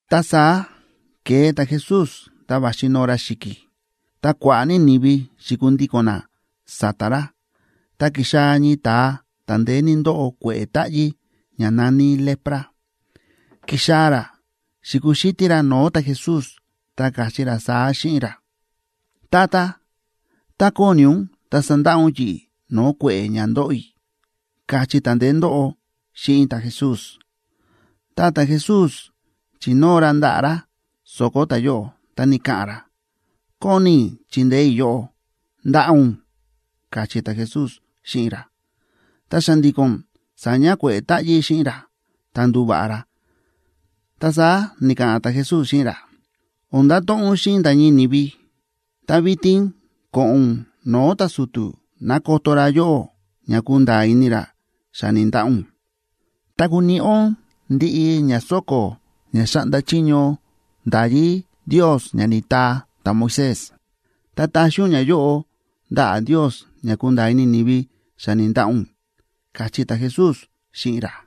Ta saá ke̱e ta̱Jesús ta va̱xi noo ra xi̱ki̱, ta kua̱ꞌa̱ ní ni̱vi xi̱kundíko̱n na sa̱ta̱ ra. Ta ki̱xaa̱ ñii ta̱a ta̱ ndeé ní ndóꞌo kue̱ꞌe̱ táꞌyí ña na̱ní lepra. Ki̱xaa̱ ra xi̱kuxítí ra no̱o̱ ta̱Jesús, ta káchí ra saá xíꞌin ra: ―Tata, tá kóni ún, ta sandaꞌa ún yi̱ꞌi̱ no̱o̱ kue̱ꞌe̱ ña ndóꞌo i̱ ―káchí ta̱ ndeé ndóꞌo xíꞌin ta̱Jesús. Ta ta̱Jesús chi̱nóo ra ndaꞌa̱ ra so̱ko̱ ta̱yóꞌo, ta ni̱ka̱ꞌa̱n ra: ―Kóni i̱ chindeé i̱ yóꞌó. ¡Ndaꞌa ún! ―káchí ta̱Jesús xíꞌin ra. Ta xa̱ndi̱ko̱n sa̱ña kue̱ꞌe̱ táꞌyí xíꞌin ra, ta ndu̱va̱ꞌa ra. Ta saá ni̱ka̱ꞌa̱n ta̱Jesús xíꞌin ra: ―O̱n ndato̱ꞌon ún xíꞌin nda̱ ñii ni̱vi. Ta vitin ko̱ꞌo̱n ún no̱o̱ ta̱su̱tu̱ ná koto ra yóꞌó ña kunda̱a̱ ini ra xa ni̱ndaꞌa ún. Ta kuniꞌi ún ndiꞌi ña so̱ko̱ ña xáꞌnda chiño nda̱yí Ndios ña ni̱taa ta̱Moisés, ta taxi ún ñayóꞌo ndaꞌa̱ Ndios ña kunda̱a̱ ini ni̱vi xa ni̱ndaꞌa ún ―káchí ta̱Jesús xíꞌin ra.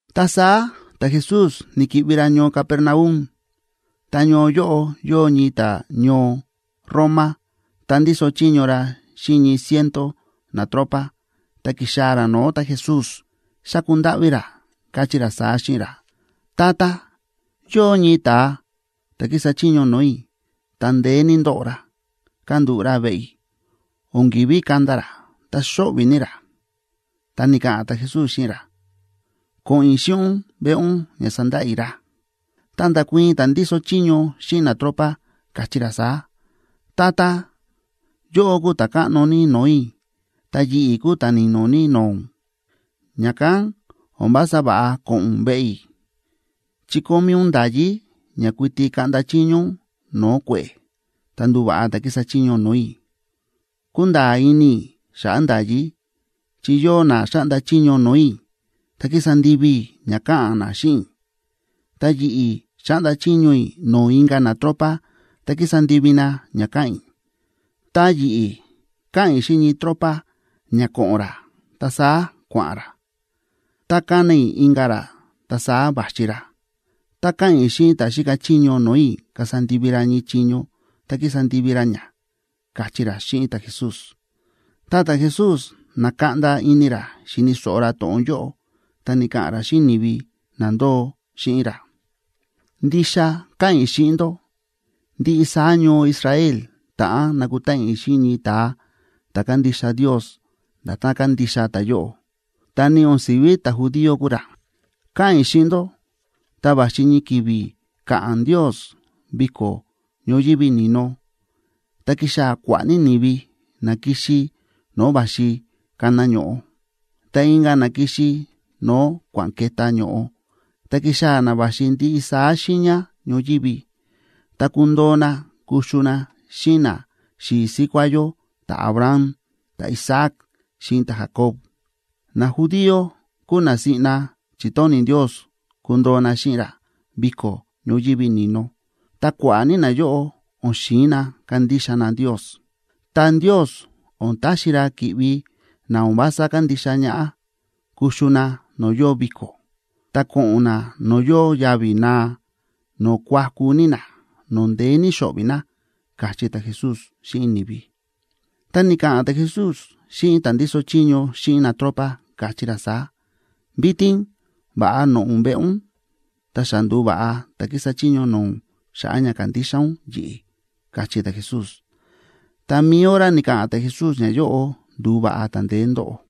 Ta saá ta̱Jesús ni̱ki̱ꞌvi ra ñoo Capernaum. Ta ñoo yóꞌo yóo ñii ta̱ñoo Roma, ta ndíso chiño ra xíꞌin ñii ciento natropa, ta ki̱xaa̱ ra no̱o̱ ta̱Jesús, xa̱ku ndáꞌví ra, káchí ra saá xíꞌin ra: ―Tata, yóo ñii ta̱a ta̱ kísa chiño no̱o̱ i̱, ta ndeé ní ndóꞌo ra, kándúꞌu̱ ra veꞌe i̱, o̱n ki̱ví kanda ra, ta xóꞌvi̱ ní ra. Ta ni̱ka̱ꞌa̱n ta̱Jesús xíꞌin ra: ―Ko̱ꞌo̱n i̱ xíꞌin ún veꞌe ún ña sandaꞌa i̱ ra. Ta nda̱kuii̱n ta̱ ndíso chiño xíꞌin natropa, káchí ra saá: ―Tata, yóꞌó kúu ta̱ káꞌno ní no̱o̱ i̱, ta yi̱ꞌi̱ kúu ta̱ ni̱no̱ ní no̱o̱ ún, ña̱kán o̱n vása va̱ꞌa ko̱ꞌo̱n ún veꞌe i̱. Chi kómí ún nda̱yí ña kuiti kaꞌnda chiño ún no̱o̱ kue̱ꞌe̱, ta nduva̱ꞌa ta̱ kísa chiño no̱o̱ i̱. Kúnda̱a̱ ini i̱ xa̱ꞌa̱ nda̱yí, chi yóo na xáꞌnda chiño no̱o̱ i̱, ta kísa ndivi i̱ ña káꞌa̱n na xíꞌin i̱; ta yi̱ꞌi̱ xáꞌnda chiño i̱ no̱o̱ inka̱ natropa, ta kísa ndivi na ña káꞌa̱n i̱. Tá yi̱ꞌi̱ káꞌa̱n i̱ xíꞌin ñii ta̱tropa ña ko̱ꞌo̱n ra, ta saá kua̱ꞌa̱n ra. Tá kána i̱ inka̱ ra, ta saá va̱xi ra. Tá káꞌa̱n i̱ xíꞌin ta̱ xíka chiño no̱o̱ i̱ kasa ndivi ra ñii chiño, ta kísa ndivi ra ña ―káchí ra xíꞌin ta̱Jesús. Ta ta̱Jesús na̱kaꞌnda ini ra xíni̱ so̱ꞌo ra to̱ꞌon yóꞌo, ta ni̱ka̱ꞌa̱n ra xíꞌin ni̱vi na ndóo xíꞌin ra: ―Ndixa káꞌa̱n i̱ xíꞌin ndó, ndiꞌi saá ñoo Israel ta̱ꞌán nakutáꞌan i̱ xíꞌin ñii ta̱a ta̱ kándixa Ndios nda̱tán kándixa ta̱yóꞌo, ta ni o̱n si̱ví ta̱judío kúu ra. Káꞌa̱n i̱ xíꞌin ndó, ta va̱xi ñii ki̱vi̱ ka̱ꞌa̱n Ndios viko̱ ñoyívi ni̱no, ta kixaa̱ kua̱ꞌa̱ ní ni̱vi, na kixi no̱o̱ va̱xi kana ño̱ꞌo, ta inka̱ na kixi no̱o̱ kua̱n ke̱tá ño̱ꞌo, ta kixaa̱ na va̱xi ndiꞌi saá xiiña ñoyívi. Ta kundoo na kuxu na xíꞌin naxi̱i̱ síkuá yó ta̱Abraham, ta̱Isaac xíꞌin ta̱Jacob. Najudío kúu na siꞌna chi̱tóni̱ Ndios kundoo na xíꞌin ra viko̱ ñoyívi ni̱no, ta kua̱ꞌa̱ ní nayóꞌo o̱n xi̱in na kandixa na Ndios. Ta Ndios o̱n taxi ra ki̱ꞌvi na o̱n vása kándixa ñaꞌá kuxu na no̱o̱ yóo viko̱, ta ko̱ꞌo̱n na no̱o̱ yóo yavi̱ naa, no̱o̱ kuaku ní na, no̱o̱ ndeé ní xo̱ꞌvi̱ na ―káchí ta̱Jesús xíꞌin ni̱vi. Ta ni̱ka̱ꞌa̱n ta̱Jesús xíꞌin ta̱ ndíso chiño xíꞌin natropa, káchí ra saá: ―Vitin va̱ꞌa, noꞌo̱ ún veꞌe ún. Ta xa ndu̱va̱ꞌa ta̱ kísa chiño no̱o̱ ún xa̱ꞌa̱ ña kándixa ún yi̱ꞌi̱ ―káchí ta̱Jesús. Ta mi̱i hora ni̱ka̱ꞌa̱n ta̱Jesús ñayóꞌo, ndu̱va̱ꞌa ta̱ ndeé ndóꞌo.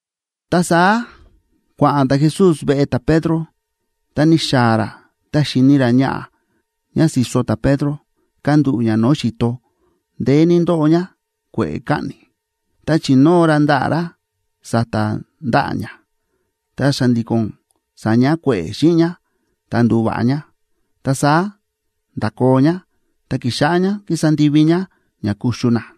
Ta saá kua̱ꞌa̱n ta̱Jesús veꞌe ta̱Pedro. Ta ni̱xaa̱ ra ta xi̱ni ra ñaꞌa̱ ñá si̱so ta̱Pedro, kándúꞌu̱ ñá no̱o̱ xi̱to, ndeé ní ndóꞌo ñá kue̱ꞌe̱ kaꞌni̱. Ta chi̱nóo ra ndaꞌa̱ ra sa̱ta̱ ndaꞌa̱ ñá, ta xa̱ndi̱ko̱n sa̱ña kue̱ꞌe̱ xíꞌin ñá ta ndu̱va̱ꞌa ñá. Ta saá nda̱koo ñá, ta ki̱xáꞌá ñá kísa ndivi ñá ña kuxu na.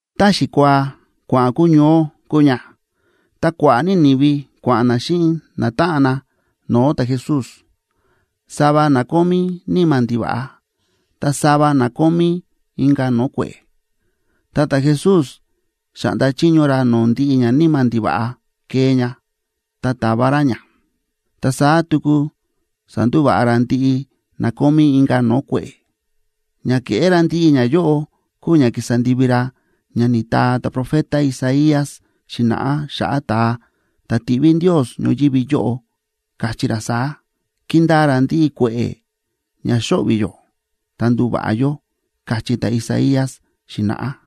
Tá xikuaa kua̱ꞌa̱n kuñoó kúu ña, ta kua̱ꞌa̱ ní ni̱vi kua̱ꞌa̱n na xíꞌin natáꞌan na no̱o̱ ta̱Jesús; sava na kómí níma̱ ndiva̱ꞌa. Ta sava na kómí inka̱ no̱o̱ kue̱ꞌe̱. Ta ta̱Jesús xa̱ꞌnda chiño ra no̱o̱ ndiꞌi ñaníma̱ ndiva̱ꞌa kee ña, ta ta̱va ra ña, ta saá tuku sa̱ndúva̱ꞌa ra ndiꞌi na kómí inka̱ no̱o̱ kue̱ꞌe̱. Ña ke̱ꞌé ra ndiꞌi ñayóꞌo kúu ña ki̱sa ndivi ra ña ni̱taa ta̱profeta Isaías xi̱na̱ꞌá xa̱ꞌa̱ ta̱a ta̱ tiꞌví Ndios ñoyívi yóꞌo, káchí ra saá: “Ki̱ndaa ra ndiꞌi kue̱ꞌe̱ ña xóꞌvi̱ yó, ta ndu̱va̱ꞌa yó”, káchí ta̱Isaías xi̱na̱ꞌá.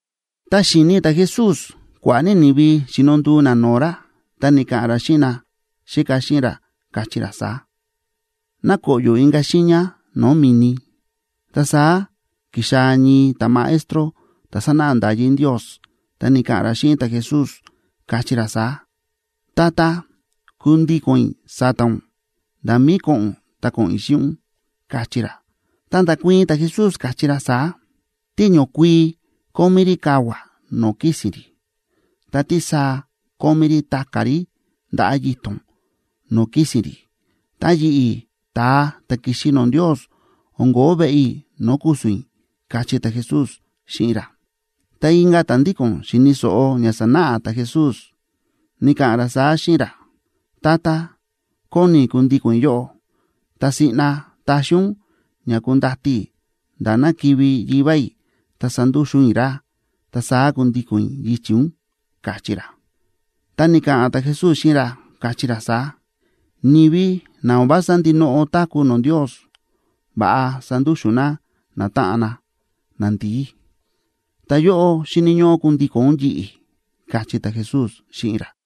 Ta xi̱ni ta̱Jesús kua̱ꞌa̱ ní ni̱vi xíno nduu na no̱o̱ ra, ta ni̱ka̱ꞌa̱n ra xíꞌin naxíka xíꞌin ra, káchí ra saá: ―Ná koꞌyo̱ inka̱ xiiña no̱o̱ mi̱ni. Ta saá ki̱xaa̱ ñii ta̱maestro ta̱ sánáꞌa nda̱yí Ndios, ta ni̱ka̱ꞌa̱n ra xíꞌin ta̱Jesús, káchí ra saá: ―Tata, kundíko̱n i̱ sa̱ta̱ ún, nda̱ mí ko̱ꞌo̱n ún ta ko̱ꞌo̱n i̱ xíꞌin ún ―káchí ra. Ta nda̱kuii̱n ta̱Jesús, káchí ra saá: ―Tíñokuii kómí rí kavua̱ no̱o̱ kísi̱n rí, ta tísaa kómí rí ta̱ka̱ rí ndaꞌa̱ yito̱n no̱o̱ kísi̱n rí, ta yi̱ꞌi̱, ta̱a ta̱ ki̱xi no̱o̱ Ndios, o̱n ko̱ó veꞌe i̱ no̱o̱ ku̱su̱n i̱ ―káchí ta̱Jesús xíꞌin ra. Ta inka̱ ta̱ ndíko̱n xíni̱ so̱ꞌo ña sánáꞌa ta̱Jesús, ni̱ka̱ꞌa̱n ra saá xíꞌin ra: ―Tata, kóni i̱ kundíko̱n i̱ yóꞌó. Ta siꞌna taxi ún ña kundati i̱ nda̱ ná kivi̱ yivá i̱, ta sandúxu̱n i̱ ra, ta saá kundíko̱n i̱ yichi̱ ún ―káchí ra. Ta ni̱ka̱ꞌa̱n ta̱Jesús xíꞌin ra, káchí ra saá: ―Ni̱vi na o̱n vása ndinoꞌo táku̱ no̱o̱ Ndios, va̱ꞌa sandúxu̱n na natáꞌan na nandi̱í. Ta yóꞌó, xíni̱ ñóꞌó kundíko̱n ún yi̱ꞌi̱ ―káchí ta̱Jesús xíꞌin ra.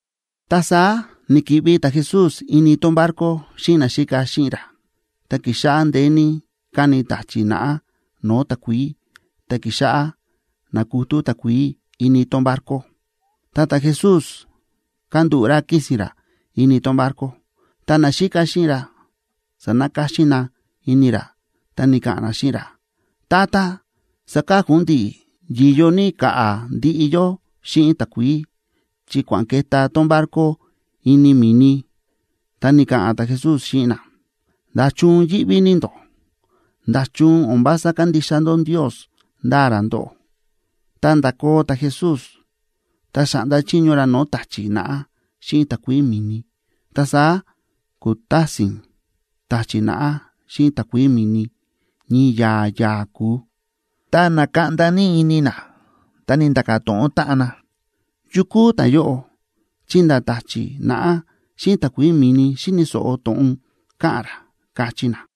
Ta saá ni̱ki̱ꞌvi ta̱Jesús ini tón barco xíꞌin naxíka xíꞌin ra. Ta ki̱xáꞌá ndeé ní káni ta̱chi̱ naꞌá no̱o̱ takuií, ta ki̱xáꞌá nákutú takuií ini tón barco. Ta ta̱Jesús kándúꞌu̱ ra kísi̱n ra ini tón barco. Ta naxíka xíꞌin ra sa̱nakáxín na ini ra, ta ni̱ka̱ꞌa̱n na xíꞌin ra: ―Tata, ¡saka̱ku ún ndi̱ꞌi̱! ¡Yi̱yo ní ka̱ꞌa̱ ndiꞌi yó xíꞌin takuií, chi kua̱n ke̱tá tón barco ini mi̱ni! Ta ni̱ka̱ꞌa̱n ta̱Jesús xíꞌin na: ―¿Nda̱chun yíꞌví ní ndó? ¿Nda̱chun o̱n vása kándixa ndó Ndios ndáa ra ndóꞌó? Ta nda̱koo ta̱Jesús, ta xa̱ꞌnda chiño ra no̱o̱ ta̱chi̱ naꞌá xíꞌin takuií mi̱ni. Ta saá ku̱tásin ta̱chi̱ naꞌá xíꞌin takuií mi̱ni, ñii ya̱a̱ ya̱a̱ ku̱u. Ta na̱kaꞌnda ní ini na, ta ni̱nda̱ka̱ to̱ꞌon táꞌan na: ―¿Yu kúu ta̱yóꞌo? ¡Chi nda̱ ta̱chi̱ naꞌá xíꞌin takuií mi̱ni xíni̱ so̱ꞌo to̱ꞌon káꞌa̱n ra! ―káchí na.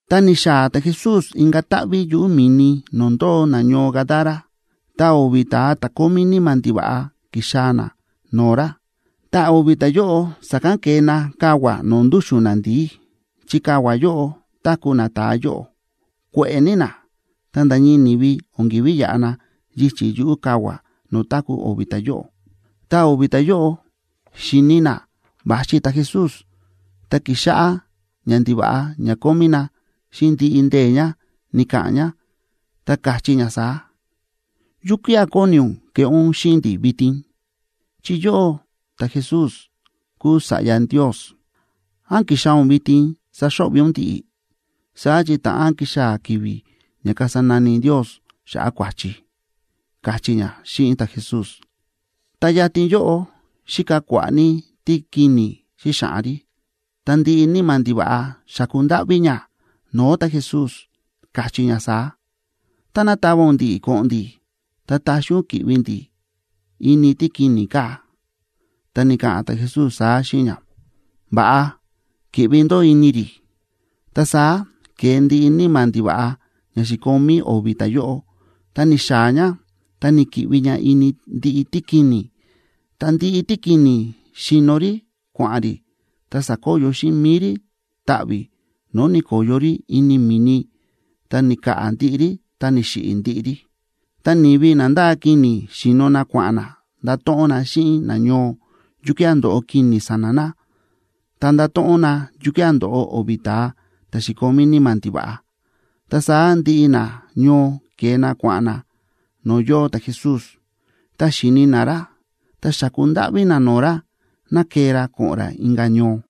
Ta ni̱xaa̱ ta̱Jesús inka̱ táꞌví yuꞌu̱ mi̱ni no̱o̱ ndóo nañoo Gadara. Ta o̱vi̱ ta̱a ta̱ kómí níma̱ ndiva̱ꞌa ki̱xaa̱ na no̱o̱ ra. Ta o̱vi̱ ta̱yóꞌo sa̱kán ke̱e na kavua̱ no̱o̱ ndúxu̱n nandi̱í, chi kavua̱ yóꞌo táku̱ nata̱a yóꞌo. Kue̱ꞌe̱ ní na, ta nda̱ ñii ni̱vi o̱n ki̱ví yaꞌa na yichi̱ yuꞌu̱ kavua̱ no̱o̱ táku̱ o̱vi̱ ta̱yóꞌo. Ta o̱vi̱ ta̱yóꞌo xi̱ni na va̱xi ta̱Jesús, ta ki̱xáꞌá ñandiva̱ꞌa ña kómí na xíꞌin ndiꞌi ndee̱ ña ni̱ka̱ꞌa̱n ña, ta káchí ña saá: ―¿Yukía̱ kóni ún keꞌé ún xíꞌin ndi̱ vitin?, chi yóꞌó ta̱Jesús kúu Sa̱ꞌya Ndios. ¿Án ki̱xaa̱ ún vitin saxo̱ꞌvi̱ ún ndi̱ꞌi̱?, saá chi ta̱ꞌán kixaa̱ ki̱vi̱ ña kasa nani Ndios xa̱ꞌa̱ kua̱chi ―káchí ña xíꞌin ta̱Jesús. Ta yatin yóꞌo xíka kua̱ꞌa̱ ní tíkini̱ xíxaꞌan rí. Ta ndiꞌi níma̱ ndiva̱ꞌa xa̱ku ndáꞌví ña no̱o̱ ta̱Jesús, káchí ña saá: ―Táná tava ún ndi̱ꞌi̱ ko̱ꞌo̱n ndi̱, ta taxi ún ki̱ꞌvi ndi̱ ini tíkini̱ kaa̱. Ta ni̱ka̱ꞌa̱n ta̱Jesús saá xíꞌin ña: ―Va̱ꞌa, ¡ki̱ꞌvi ndó ini rí! Ta saá ke̱e ndiꞌi níma̱ ndiva̱ꞌa ña xi̱komí o̱vi̱ ta̱yóꞌo, ta ni̱xaa̱ ña ta ni̱ki̱ꞌvi ña ini ndiꞌi tíkini̱, ta ndiꞌi tíkini̱ xi̱no rí kua̱ꞌa̱n rí, ta sa̱koyo xíꞌin mi̱i rí taꞌvi̱, no̱o̱ ni̱ko̱yo rí ini mi̱ni, ta ni̱ka̱ꞌa̱ ndiꞌi rí ta ni̱xiꞌi̱ ndiꞌi rí. Ta ni̱vi na ndáa kini̱ xíno na kua̱ꞌa̱n na ndato̱ꞌon na xíꞌin nañoo, yukía̱ ndo̱ꞌo kini̱ sa̱na̱ na, ta nda̱to̱ꞌon na yukía̱ ndo̱ꞌo o̱vi̱ ta̱a ta̱ xi̱komí níma̱ ndiva̱ꞌa. Ta saá ndiꞌi nañoo ke̱e na kua̱ꞌa̱n na no̱o̱ yóo ta̱Jesús. Tá xi̱ni na ra, ta xáku ndáꞌví na no̱o̱ ra ná kee ra ko̱ꞌo̱n ra inka̱ ñoo.